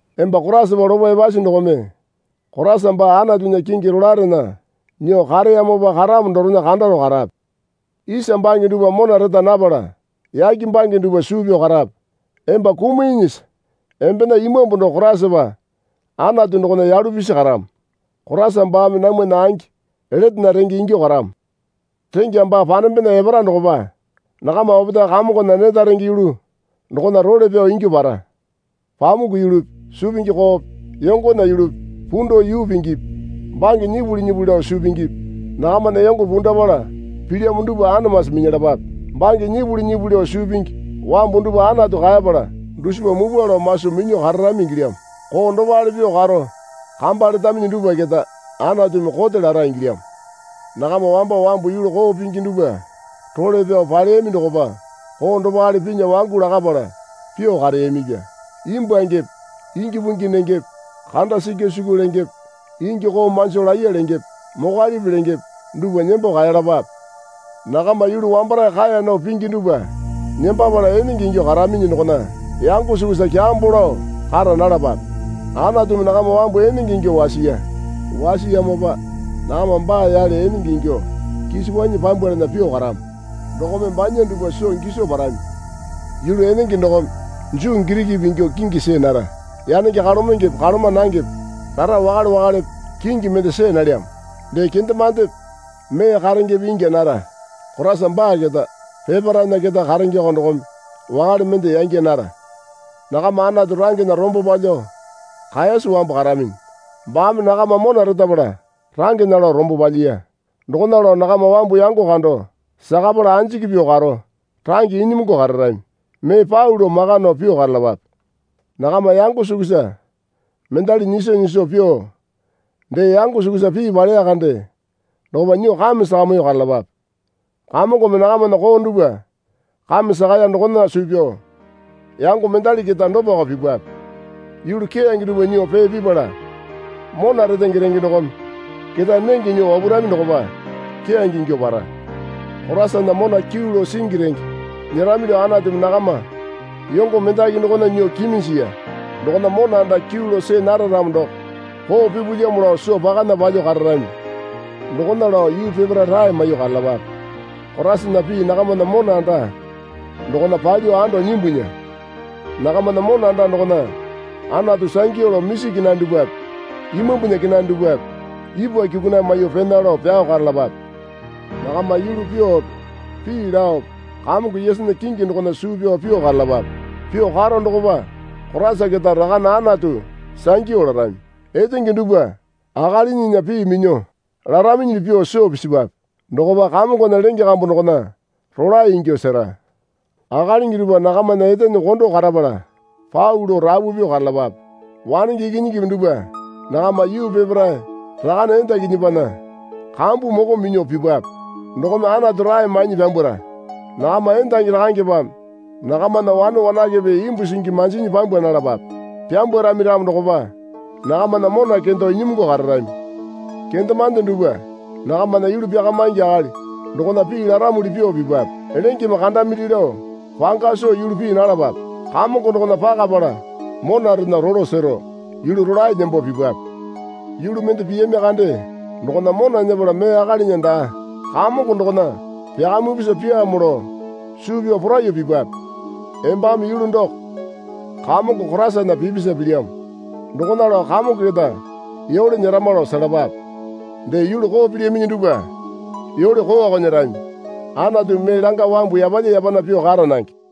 Emba Koraisapa lopo epasi dokome Koraisa baa Anatunya kingi rolaerena nyuo kareyamopa karamo dorena kandaro karape. Isa bange dupwa mona reta napala yake bange dupwa suu pyao karape. Emba kumiinyisa embena imambu doko Koraisapa Anatu dokona yalu pisi karamo. Koraisa baame namwana angi letena renge ingyuo karamo. Rengya baa panembena epara dokopa nakama opetae Kamongona neta renge yulu dokona role pyao ingyuo para. Pamuku yulupi suu pingi koope yongona yulupi pundao yuu pingipi bange nyipuli nyipuli lao suu pingipi nakamana yongo pundapala pilyamo dupwa anamasi minyalapape. Bange nyipuli nyipuli lao suu pingi wambu dupwa Anatu kaepala dusipa mupwa lao maso minyuo kararami ingilyamo. Koo dopale pyuo karo kamba letaminyi dupwa keta Anatumi kote lara ingilyamo. Nakama wamba wambu yulu koo pingi dupwa role pyao paleyami dokopa koo dopale pinya wangu lakapala pyuo kareyamipya. Imbwuangepe ingi pungipi nengepe kanda sikya sikyu lengepe ingi koo manjo laiya lengepe mokwalipi lengepe dupwa nembo kaeyalapape. Nakama yulu wambarae kaeya nao pingi dupwa nembapala enenge ingyuo karaminyi dokona yango sukusa kyambo lao kara nalapape. Anatumi nakama wambu enenge ingyuo wasiya. Wasiyamopa nakama baa yale enenge ingyuo kisokwanyi pyambwalana pyuo karamo dokome banya dupwa soo giso parami. Yulu enenge dokome Juu Girikipi ingyuo kingi see nara. Yanenge kalomengepe kaloma nangepe rara wakale wakalepe kingi mende see nalyamo. Dee kendemandepe mee karengepe ingya nara. Koraisa baa keta peparaena keta karengeoko dokome wakale mende yangya nara. Nakama Anatu rangena rombo palyuo kaeyasi wambu karaminyi. Baame nakama mona retapala rangena lao rombo palyiya. Dokona lao nakama wambu yango kando sakapala anjiki pyuo karo range inyimungu kararami. Mee pau lao maka nao pyuo karalapape. Nakama yango sukusa mendali nyiso nyiso pyuo dee yango sukusa pii paleya kande dokopa nyuo kame sakamyuo karalapape. Kamongome nakamana koo dupwa kame sakaya dokona suu pyao yango mendali keta dopako pipwape. Yulu keyange dupwa nyuo pee pipala mona retenge renge dokome ketae nenge nyuo wapurami dokopa keyange ingyuo para. Koraisana mona kyuu lao singi renge nyerami lao Anatumi nakama yongo mendaki dokona nyuo kiminjiya. Dokona mona anda kyuu lao see nara ramo doko koo pipulyamo lao soo pakana palyuo kararami. Dokona lao yuu peparae rae maiyuo karalapape. Koraisana pii nakamana mona anda dokona palyuo ando nyimbunya. Nakamana mona anda dokona Anatu sangyu lao misi kenane dupwape imambunya kenane dupwape ipwa kyukunaiye maiyuo pena lao pyao karalapape. Nakama yulu pyuope pii laope Kamongo Yesunya kingi dokona suu pyao pyuo karalapape. Pyuo karo dokopa Koraisa keta Rakane Anatu sangyu larami. Etenge dupwa akalinyinya pii minyuo laraminyili pyuo soo pisipwape. Dokopa Kamongona lenge kambu dokona rolae ingyuo sera. Akalingi dupwa nakamana etene kondo karapala pau lao rapu pyuo karalapape. Wanenge ikinyingipi dupwa nakama yuu peparae rakane endakinyipinya kambu moko minyuo pipape. Dokome Anatu rae mainyi pyambwara. Nakama endangi rakangepeme nakamana wane wanakepe imbu singi manjinyi pyambwa nalapape. Pyambwarami ramo dokopa nakamana mona kendo inyimungu kararami. Kendemande dupwa nakamana yulu pyakamingi akali dokona pii laramuli pyuo pipape. Lengeme kandamili lao panga soo yulu pii nalapape. Kamongo dokona pakapala monarena rolo sero yulu rolae nembo pipape. Yulu mende piyami kande dokona mona nyepala mee akalinya daa Kamongo dokona pyakamipusa pyaamo lao suu pyao poraiyuo pipape. Embame yulu doko Kamongo Koraisana pipisa pilyamo. Dokona lao Kamongo keta yole nyerama lao selapape. Dee yulu koo pilyaminyi dupwa yole kooko nyerami. Anatumi mee langa wambu yapalya yapana pyuo kara nange.